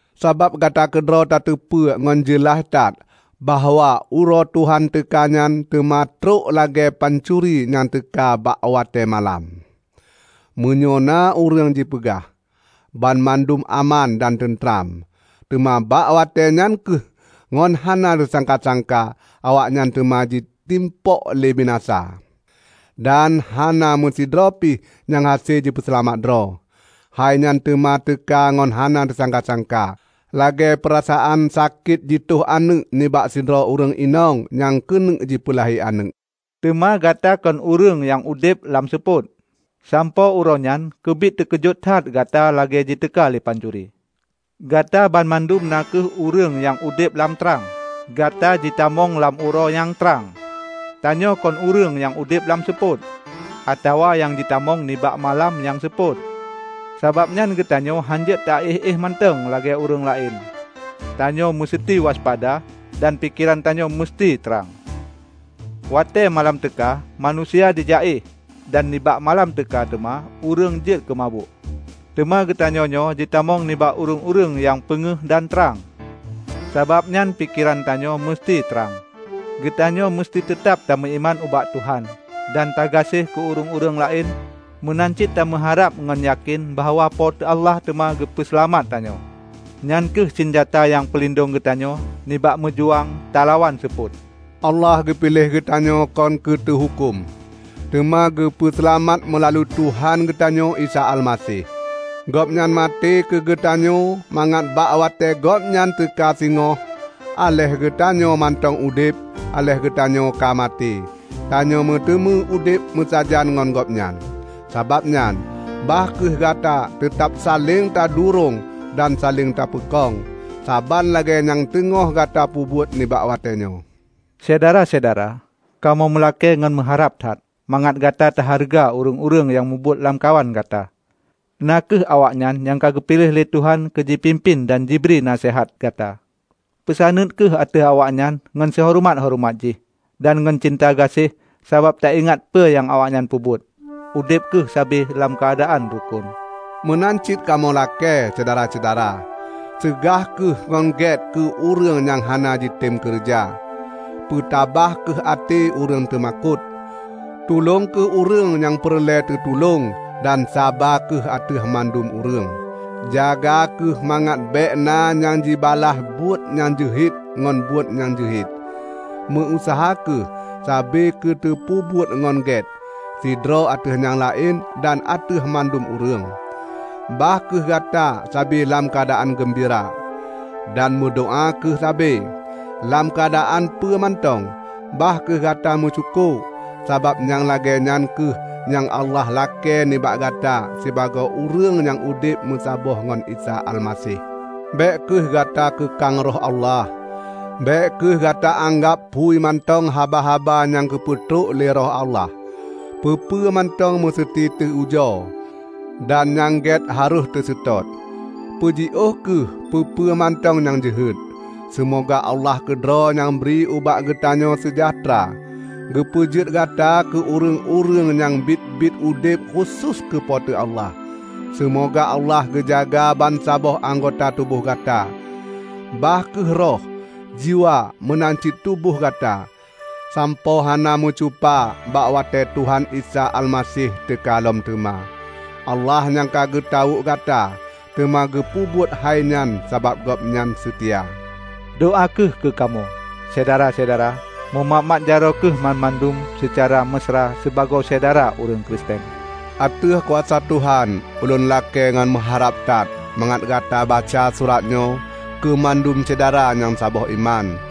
Sabab gata keudroe tateupeue ngon jeulaih that bahwa Uroe Tuhan teuka nyan teuma trok lagée pancuri nyang teuka bak watée malam. Meunyoe na ureuëng jipeugah, "Banmandum aman dan teuntram," teuma bak watée nyan kheueh ngon hana teusangka-sangka awaknyan teuma jitimpok lé binasa, dan hana meusidroe pih nyang hase jipeuseulamat droe. Hai nyan teuma teuka ngon hana teusangka-sangka, lagée peurasaan sakét jitôh aneuëk nibak sidroe ureuëng inong nyang keuneuk jipeulahé aneuëk. Teuma gata kon ureuëng nyang udeb lam seupôt, sanpoe uroenyan keubiet teukeujot that gata lagée jiteuka lé pancuri. Gata banmandum na kheueh ureuëng nyang udeb lam trang; gata jitamong lam uroe nyang trang. Tanyoe kon ureuëng nyang udeb lam seupôt; atawa nyang jitamong nibak malam nyang seupôt. Sabab nyan geutanyoe hana jeuet taéh-éh mantong lagée ureuëng laén. Tanyoe meuseuti waspada dan pikeran tanyoe meuseuti trang. Watée malam teuka manusia jijak éh, dan nibak malam teuka teuma ureuëng jeuet keumabök. Teuma geutanyoe nyoe jitamong nibak ureuëng-ureuëng nyang peungéh dan trang; sabab nyan pikeran tanyoe meuseuti trang. Geutanyoe meuseuti teutab meuiman ubak Tuhan dan tagaséh keu ureuëng-ureuëng laén meunan cit tameuharab ngon yakén bahwa Po teu Allah teuma geupeu seulamat tanyoe. Nyan kheueh sinjata nyang peulindong geutanyoe nibak meujuang talawan seupôt. Allah geupiléh geutanyoe kon keu teuhuköm, teuma geupeu seulamat meulalu Tuhan geutanyoe Isa Almaseh. Gobnyan maté keugeutanyoe mangat bak watée Gobnyan teuka singoh -- aléh geutanyoe mantong udeb, aléh geutanyoe ka maté -- tanyoe meuteumé udeb meusajan ngon Gobnyan. Sabab nyan, bah kheueh gata teutab saléng tadurong dan saléng tapeukong, saban lagée nyang teungoh gata peubuet nibak watée nyoe. Syedara-syedara, kamoe meulakée ngon meuharab that mangat gata tahareuga ureuëng-ureuëng nyang mubuet lamkawan gata; na kheueh awaknyan nyang ka geupiléh lé Tuhan keu jipimpén dan jibri naseuhat gata. Peusaneut kheueh ateueh awaknyan ngon sihoreumat-horeumat jih dan ngon cinta gaséh sabab taingat peue nyang awaknyan peubuet. Udeb kheueh sabe lam keuadaan rukon. Meunan cit kamoe lakée, Syedara-syedara, seugah kheueh ngon gét keu ureuëng nyang hana jitem keureuja; peutabah kheueh até ureuëng teumakot; tulông kheueh ureuëng nyang peureulée teutulông dan saba kheueh ateueh mandum ureuëng. Jaga kheueh mangat bék na nyang jibalaih buet nyang jeuhet ngon buet nyang jeuhet. Meu-useuha kheueh sabe keu tapeubuet nyang gét, sidroe ateueh nyang laén dan ateueh mandum ureuëng. Bah kheueh gata sabe lam keuadaan geumbira, dan meudoá kheueh sabe. Lam keuadaan peue mantong bah kheueh gata meusyukoe, sabab nyang lagée nyan kheueh nyang Allah lakée nibak gata sibagoe ureuëng nyang udeb meusaboh ngon Isa Almaseh. Bék kheueh gata keukang Roh Allah. Bék kheueh gata anggab phui mantong haba-haba nyang geupeutrok lé Roh Allah. Peue-peue mantong meuseuti teu ujoe, dan nyang gét harôh teuseutôt. Peujiôh kheueh peue-peue mantong nyang jeuhet. Seumoga Allah keudroe nyang bri ubak geutanyoe seujahteura, geupeujeuet gata keu ureuëng-ureuëng nyang biet-biet udeb khusos keu Po teu Allah. Seumoga Allah geujaga bansaboh anggota tuboh gata, bah kheueh roh, jiwa meunan cit tuboh gata,sampoe hana meucupa bak watée Tuhan Isa Almaseh teuka lom teuma. Allah, nyang ka geutawök gata, teuma geupeubuet hainyan sabab Gobnyan seutia. Doá kheueh keukamoe, Syedara-syedara! Meumat-mat jaroe kheueh banmandum seucara meusra sibagoe syedara ureuëng Kristen. Ateueh kuasa Tuhan, ulôn lakée ngon meuharab that mangat gata baca surat nyoe keumandum syedara nyang saboh iman.